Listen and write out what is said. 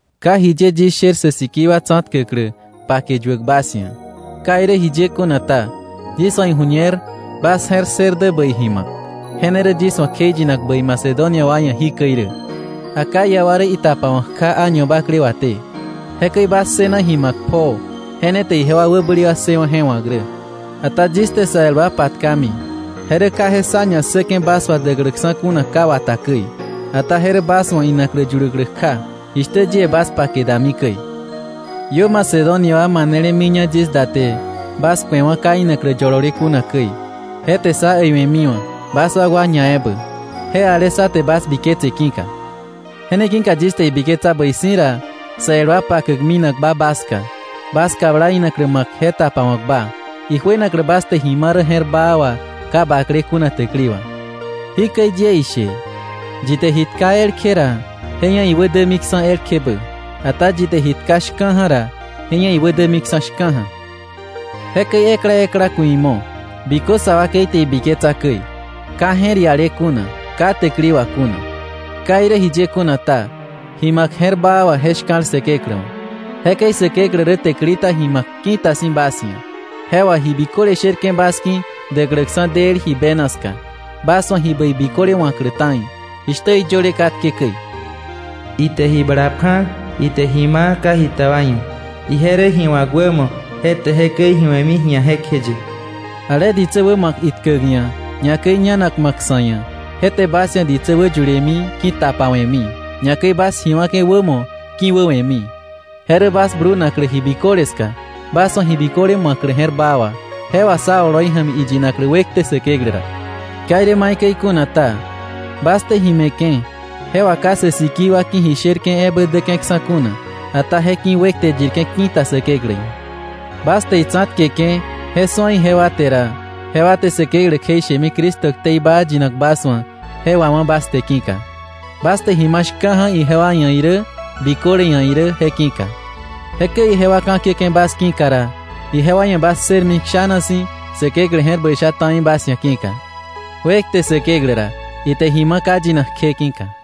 Ka jiye yis sher sä sikii wa tsa̱tkäklä pake yuäk bas ia̱. Ka irä jiye kuna ta, yis wa̱ iju̱ñer bas je̱r ssër dä bäi ji ma̱k, je ne rä yis wa̱ kjeiyinak bäi Macedonia wa ia̱ jikäi rä: “Acaya wa rä itapawa̱k kja año bakle waté.” Jekäi bas ssëna ji ma̱k pjoo, je ne te ijewa wäbäli ssëwa̱ je wa̱k rä. Ata yis te sa el wa patkami, je rä ka je sá ña ssäke̱ bas wà däkläksa̱ kuna ka wata käi, ata je rä bas wa̱ inaklä yuläklä kja, jishtä yie bas pake dami käi. Iö Macedonia wa manele miña yis da te bas ku̱ewa̱ ka inaklä yolole kuna käi. Je te sá äiwe̱miwa̱, bas wakwa ñaebä, je ale sá te bas biketse ki̱ka. Je ne ki̱ka yis te ibiketsa bäi si̱ ra sa el wa pakäk minakba bas ska, bas kabla inaklä ma̱k je tapawa̱kba, ijuenaklä bas te ji ma̱ rä je̱r baa wà ka baklé kuna täkili wà. Jikäi yie ishe: Yi te ji tka elkje ra, je ia̱ iwä dämiksa̱ elkjebä; ata yi te ji tka shka̱ja̱ ra, je ia̱ iwä dämiksa̱ shka̱ja̱. Jekäi ekla ekla ku̱ imo̱, bikö sa wakei te ibiketsa käi, ka je̱r iale kuna, ka täkili wà kuna. Ka irä jiye kuna ta, ji ma̱k je̱r baa wà je shka̱l Säkeklä wa̱. Jekäi Säkeklä rä täkili ta ji ma̱k ki̱ta si̱ bas ia̱, je wà ji biköle sherke̱ bas ki̱ däkläksa̱ del ji bena ska, bas wa̱ ji bäi biköle wa̱klä ta̱i, jishtä iyöle katke käi: “Ite ji bala pja̱. Ite ji ma̱ ka jita wa ia̱. Ije rä ji wa̱k wämo, je te jekäi ji we̱mi ji̱a jekjeye.” Ale ditsä wä ma̱k itkäk ia̱, ñakäi ñanak ma̱k sa̱ ia̱, je te bas ia̱ ditsä wä yulemi ki̱tapawe̱mi, ñakäi bas ji wa̱ke̱ wämo ki̱wäwe̱mi. Je rä bas blunaklä ji biköle ska, bas wa̱ ji biköle ma̱klä je̱r baa wà, je wà sá oloi ja̱mi iyinaklä wekte Säkeklä ra. Ka irä maikäi kuna ta, bas te ji me̱ke̱ je wá ka sä sikii wa ki̱ ji shërke̱ ebä däke̱ksa̱ kuna, ata je ki̱ wekte yirke̱ ki̱ta Säkeklä ia̱. Bas te itsa̱tkeke̱ je su̱a ijewa te ra, jewa te Säkeklä kjeishemi Cristo ktei baa yinak bas wa̱ je wawá̱ bas te ki̱ka, bas te ji ma̱ shka̱ja̱ ijewa ia̱ irä, biköle ia̱ irä je ki̱ka. Jekäi ijewa ka̱kiäke̱ bas ki̱ka ra, ijewa ia̱ bas ssërmi kshana si̱ Säkeklä je̱r bäi sha ta̱i bas ia̱ ki̱ka. ¡Wekte Säkeklä ra, ite ji ma̱ ka yinak kje ki̱ka!